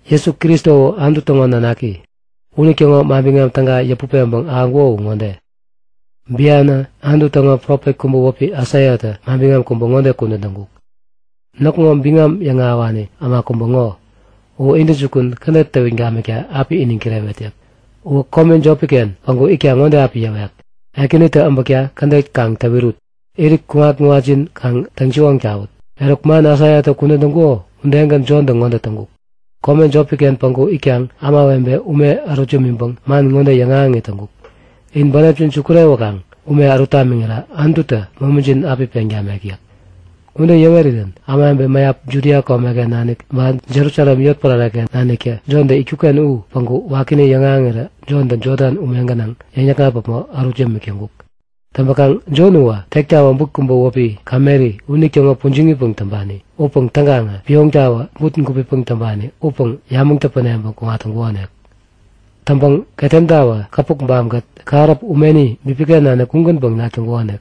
Jesu Kristo u Anutu täŋo Nanaki. Unitäŋo Manbiŋam Täga yäput peŋpäŋ ahäŋkuko u ŋode; Bianä Anutu täŋo profet kubä wäpi Aisaiatä manbiŋam kubä ŋode kudän täŋkuk; Näkŋo biŋam yäŋahäwani äma kubä ŋo. U intäjukun kädet täwit gamikta api iniŋ kirewet yäk. Uwä kome jopi-ken päŋku itkaŋ ŋode api yäwek; Ekänitä äbäkta kädet kaŋ täwirut! Irit kuŋat-kuŋatjin kaŋ täŋsiwoŋ tawut! Eruk, man Aisaiatä kudän täŋkuko udegän Jontä ŋode täŋkuk. Kome jopi-ken päŋku itkaŋ ämawebeta ume ärut yämiŋpäŋ man ŋode yäŋahäŋit täŋkuk; In bänepjin sukurewäkaŋ ume ärut tamiŋira Anututä momijin api peŋ tamek yäk. Ude yäwerirän ämawebe mäyap Judia komeken nanik ba Jerusalem yotpärare-ken naniktä Jontä itkuk-ken u päŋku wakini yäŋahäŋirä Jontä Jodan ume gänaŋ yäŋ-yäkŋat päpmo ärut yämik täŋkuk. Täŋpäkaŋ Jon uwä tektawä but kubä wäpi kameri unitäŋo pujiŋipäŋ täŋpani upäŋ täŋkaŋä pioŋtawä but gupipäŋ täŋpani upäŋ yamäŋ täpäneŋpäŋ kuŋat täŋkukonik. Täŋpäŋ ketemtawä käpukbam-kät kähäräp umeni bipiken nanik ugänpäŋ nak täŋkukonik.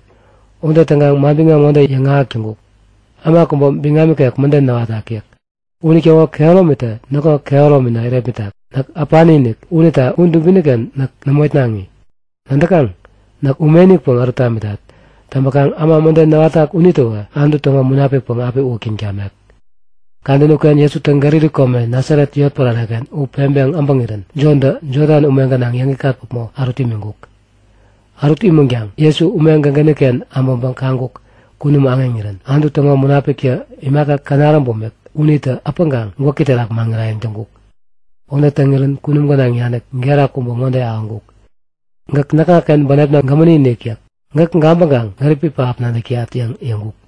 Ude täŋkaŋ manbiŋam ŋode yäŋahäk täŋkuk; Äma kubä biŋam ikek mäden näwatak yäk. Unitäŋo kehäromitä näkŋo kehäromina irepmitak. Näk äpani-inik unita u dubini-ken näk nämo itnaŋi. Nadäkaŋ? Näk ume-inikpäŋ ärut tamitat. Täŋpäkaŋ äma mäden näwatak unitäwä Anutu täŋo Munapikpäŋ api uwäktäŋ tamek yäk. Kadäni uken Jesutä Galili kome Nasaret yotpärare u peŋpeŋ abäŋirän Jontä Jodan ume gänaŋ yäŋikŋat päpmo ärut imiŋkuk. Ärut imänkaŋ Jesu ume gägäni-ken äbäŋpäŋ kaŋkuk; Kunum aŋeŋirän Anutu täŋo Munapiktä imaka känaräm bumik unitä äpäŋkaŋ gwäki terak maŋirayäŋ täŋkuk. Ude täŋirän kunum gänaŋ nanik gera kubä ŋode ahäŋkuk; Gäk näkŋaken bänepna gämäni-inik yäk. Gäk gabäŋkaŋ gäripi pähap nadäk täyat yäŋ yäŋkuk.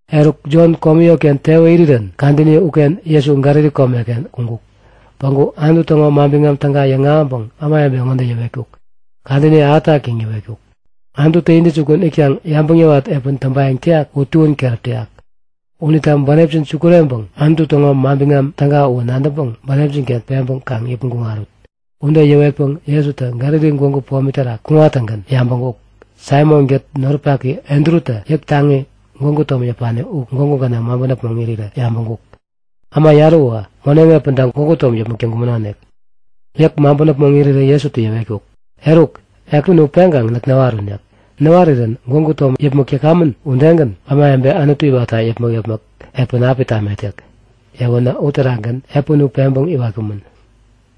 Eruk, Jon komi yotken tewä irirän kadäni uken Jesu Galili komeken kuŋkuk. Päŋku Anutu täŋo Manbiŋam Täga yäŋahäŋpäŋ ämawebe ŋode yäwetkuk; Kadäni ahätak yäŋ yäwetkuk. Anututä intäjukun itkaŋ yabäŋ yäwat epän täŋpayäŋ täyak u tuän keräp täyak! Unita bänepjin sukureŋpäŋ Anutu täŋo Manbiŋam Täga uwä nadäŋpäŋ bänepjin-ken peŋpäŋ kaŋ yäpmäŋ kuŋarut! Ude yäwetpäŋ Jesutä Galili gwägu pomi terak kuŋattäŋgän yabäŋkuk; Saimon-kät noripaki Andrutä yäk taŋi, gwägu tom yäpani u gwägu gänaŋ maŋpän äpmoŋ irirän yabäŋkuk. Äma yarä uwä moneŋ epänta gwägu tom yäpmäk täŋkumänonik. Yäk maŋpän äpmoŋ irirän Jesutä yäwetkuk; Eruk! Epän u peŋkaŋ näk näwarun! Näk näwarirän gwägu tom yäpmäk täkamän udegän ämawebe Anutu iwatta yäpmäk-yäpmäk epän api tamet yäk. Yäweränä uterakgän epäni u peŋpeŋ iwatkumän.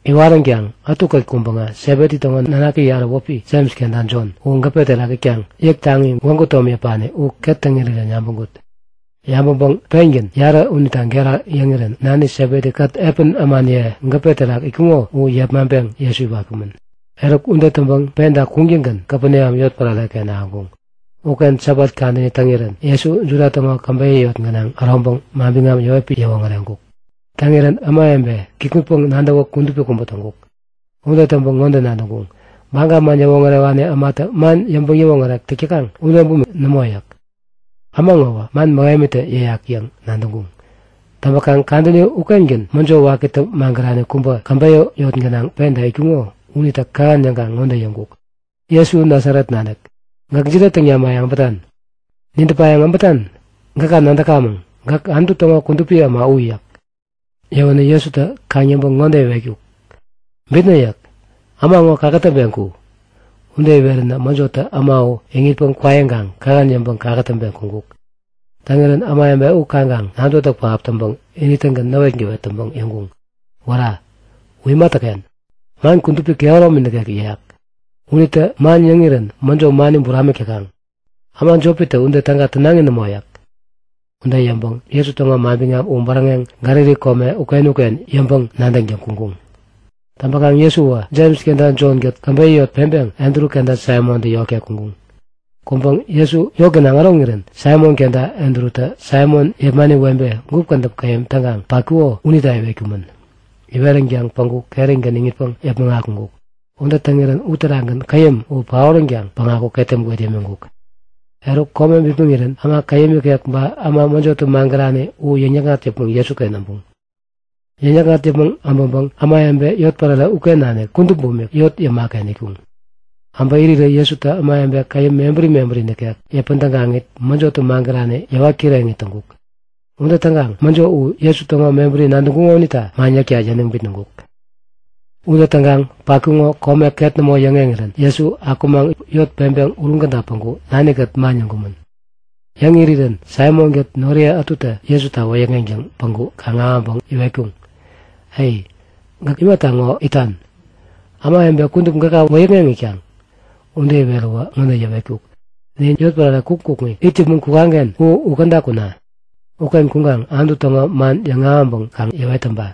Iwaränkaŋ ätukät kuŋpäŋä Sebedi täŋo nanaki yarä wäpi Jems kenta Jon u gäpe terak itkaŋ yäk taŋi, gwägu tom yäpani u ket täŋ irirän yabäŋkuk. Yabäŋpäŋ pengän yarä unita gera yäŋirän nani Sebedi-kät epän ämaniye gäpe terak itkuŋo u yepmaŋpeŋ Jesu iwatkumän. Eruk ude täŋpäŋ penta kuŋtäŋgän Kapeneam yotpärare-ken ahäŋkuŋ. Uken Sabat kadäni täŋirän Jesu Juda täŋo käbeyä yot gänaŋ äroŋpäŋ manbiŋam yäwetpäŋ yäwoŋäreŋkuk. Täŋirän ämawebe kikŋutpäŋ nadäwä kudupi kubä täŋkuk. Ude täŋpäŋ ŋode nadäŋkuŋ; Baga man yäwoŋärewani ämatä man yäŋpäŋ-yäwoŋärek täk täkaŋ ude bumik nämo yäk. Äma ŋowä man mähemitä yäyak yäŋ nadäŋkuŋ. Täŋpäkaŋ kadäni ukengän mäjo wakitä magärani kubä käbeyä yot gänaŋ penta itkuŋo unitä kähän yäŋkaŋ ŋode yäŋkuk; Jesu, Nasaret nanik, gäk jide täŋ nimayäŋ äbätan? Nidäpayäŋ äbätan? Gäka nadäkamäŋ. Gäk Anutu täŋo Kudupi Äma u! yäk. Yäwänä Jesutä kaŋ-yäŋpäŋ ŋode iwetkuk; Bitnä! yäk. Äma ŋo kakätäŋpeŋ ku! Ude iweränä mäjotä äma uwä iŋitpäŋ kwaiŋkaŋ kähän yäŋpäŋ kakätäŋpeŋ kuŋkuk. Täŋirän ämawebe u kaŋkaŋ nadäwätäk pähap täŋpäŋ ini-tägän näwetgäwet täŋpäŋ yäŋkuŋ; Wära! U imatäken? Man kudupi kehäromi nikek yäyak! Unitä man yäŋirän mäjo mani buramik täkaŋ. Äma jopitä ude täga tänaŋi nämo yäk. Ude yäŋpäŋ Jesu täŋo biŋam u bäräŋeŋ Galili kome uken-uken yäŋpäŋ-nadäŋtäŋ kuŋkuŋ. Täŋpäkaŋ Jesu uwä Jems kenta Jon-kät käbeyä yot peŋpeŋ Andru kenta Saimontä yotken kuŋkuŋ. Kuŋpäŋ Jesu yot gänaŋ äroŋirän Saimon kenta Andrutä Saimon yepmani webe gup kädäp käyäm täŋkaŋ patkuko unita iwetkumän. Iweränkaŋ päŋku kerigän iŋitpäŋ yäpmäŋ akuŋkuk. Ude täŋirän uterakgän käyäm u paoränkaŋ päŋku ketem gwet yämiŋkuk. Eruk kome bipmäŋirän äma käyäm ikek ba äma mäjotä magärani u yäŋ-yäkŋat yäpmäŋ Jesuken äbuŋ. Yäŋ-yäkŋat yäpmäŋ äbäŋpäŋ ämawebe yotpärare uken nanik kudup bumik yot yäma-ken itkuŋ. Äbä irirä Jesutä ämawebe käyäm mebäri mebäri nikek yäpän tägaŋit mäjotä magärani yäwat kireŋit täŋkuk. Ude täŋkaŋ mäjo u Jesu täŋo mebäri nadäŋkuŋo unita man yäkta yäniŋ bitnäŋkuk. Ude täŋkaŋ patkuko kome ket nämo yäŋeŋirän Jesu akumaŋ yot peŋpeŋ uruŋ käda päŋku nani-kät man yäŋkumän. Yäŋ irirän Saimon-kät noriye ätutä Jesuta wäyäkŋeŋtäŋ päŋku kaŋ-ahäŋpäŋ iwetkuŋ; E! Gäk imata ŋo itan? Ämawebe kudup gäka wäyäkŋeŋ itkaŋ! Ude iweräwä ŋode yäwetkuk; Nin yotpärare kukŋi kukŋi it yäpmäŋ kukaŋ-ken u käda kuna! Uken kuŋkaŋ Anutu täŋo man yäŋahäŋpäŋ kaŋ yäwet täŋpa.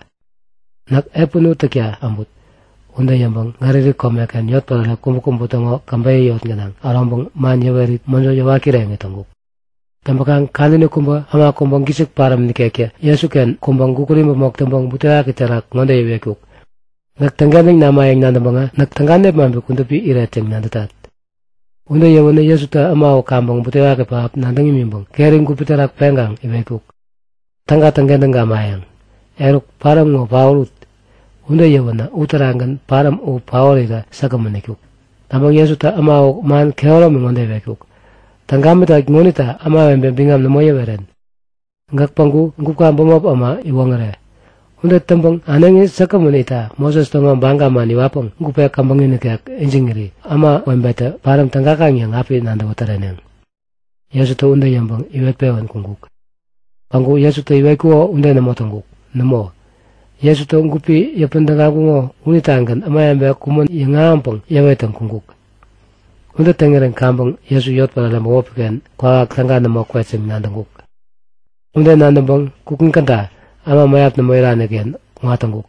Näk epän u täkta äbut. Ude yäŋpäŋ Galili komeken yotpärare kubäkubä täŋo käbeyä yot gänaŋ äroŋpäŋ man yäwerit mäjo yäwat kireŋit täŋkuk. Täŋpäkaŋ kadäni kubä äma kubä gisik paräm ikektä Jesuken kuŋpäŋ gukut imäpmok täŋpäŋ butewaki terak ŋode iwetkuk; Gäk täŋkentäŋ namayäŋ nadäŋpäŋä näk täga nepmaŋpi kudupi iret yäŋ nadätat. Ude yäwänä Jesutä äma u kaŋpäŋ butewaki pähap nadäŋ imiŋpäŋ keri gupi terak peŋkaŋ iwetkuk; Täga täŋkentäŋ gamayäŋ. Eruk, paräm ŋo paorut! Ude yäwänä uterakgän paräm u paorirä säkgämän itkuk. Täŋpäŋ Jesutä äma u man kehäromi ŋode iwetkuk; Täŋ gamitat ŋonita ämawebe biŋam nämo yäweren. Gäk päŋku gupka bämop äma iwoŋäre. Ude täŋpäŋ äneŋi säkgämän itta Moses täŋo baga man iwatpäŋ gupe käbäŋi nikek ijiŋiri ämawebetä paräm tägakaŋ yäŋ api nadäwä täreneŋ. Jesutä ude yäŋpäŋ iwet-pewän kuŋkuk. Päŋku Jesutä iwetkuko ude nämo täŋkuk. Nämo, Jesutä gupi yäpän tägaŋkuŋo unitagän ämawebe kumän yäŋahäŋpäŋ yäwettäŋ kuŋkuk. Ude täŋirän kaŋpäŋ Jesu yotpärare bämopi-ken kwawak täga nämo kwet yäŋ nadäŋkuk. Ude nadäŋpäŋ kukŋi käda, äma mäyap nämo irani-ken kuŋat täŋkuk.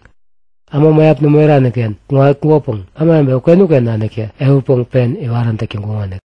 Äma mäyap nämo irani-ken kuŋatkukopäŋ ämawebe uken-uken naniktä ehutpäŋ pen iwarän täk täŋkuŋonik.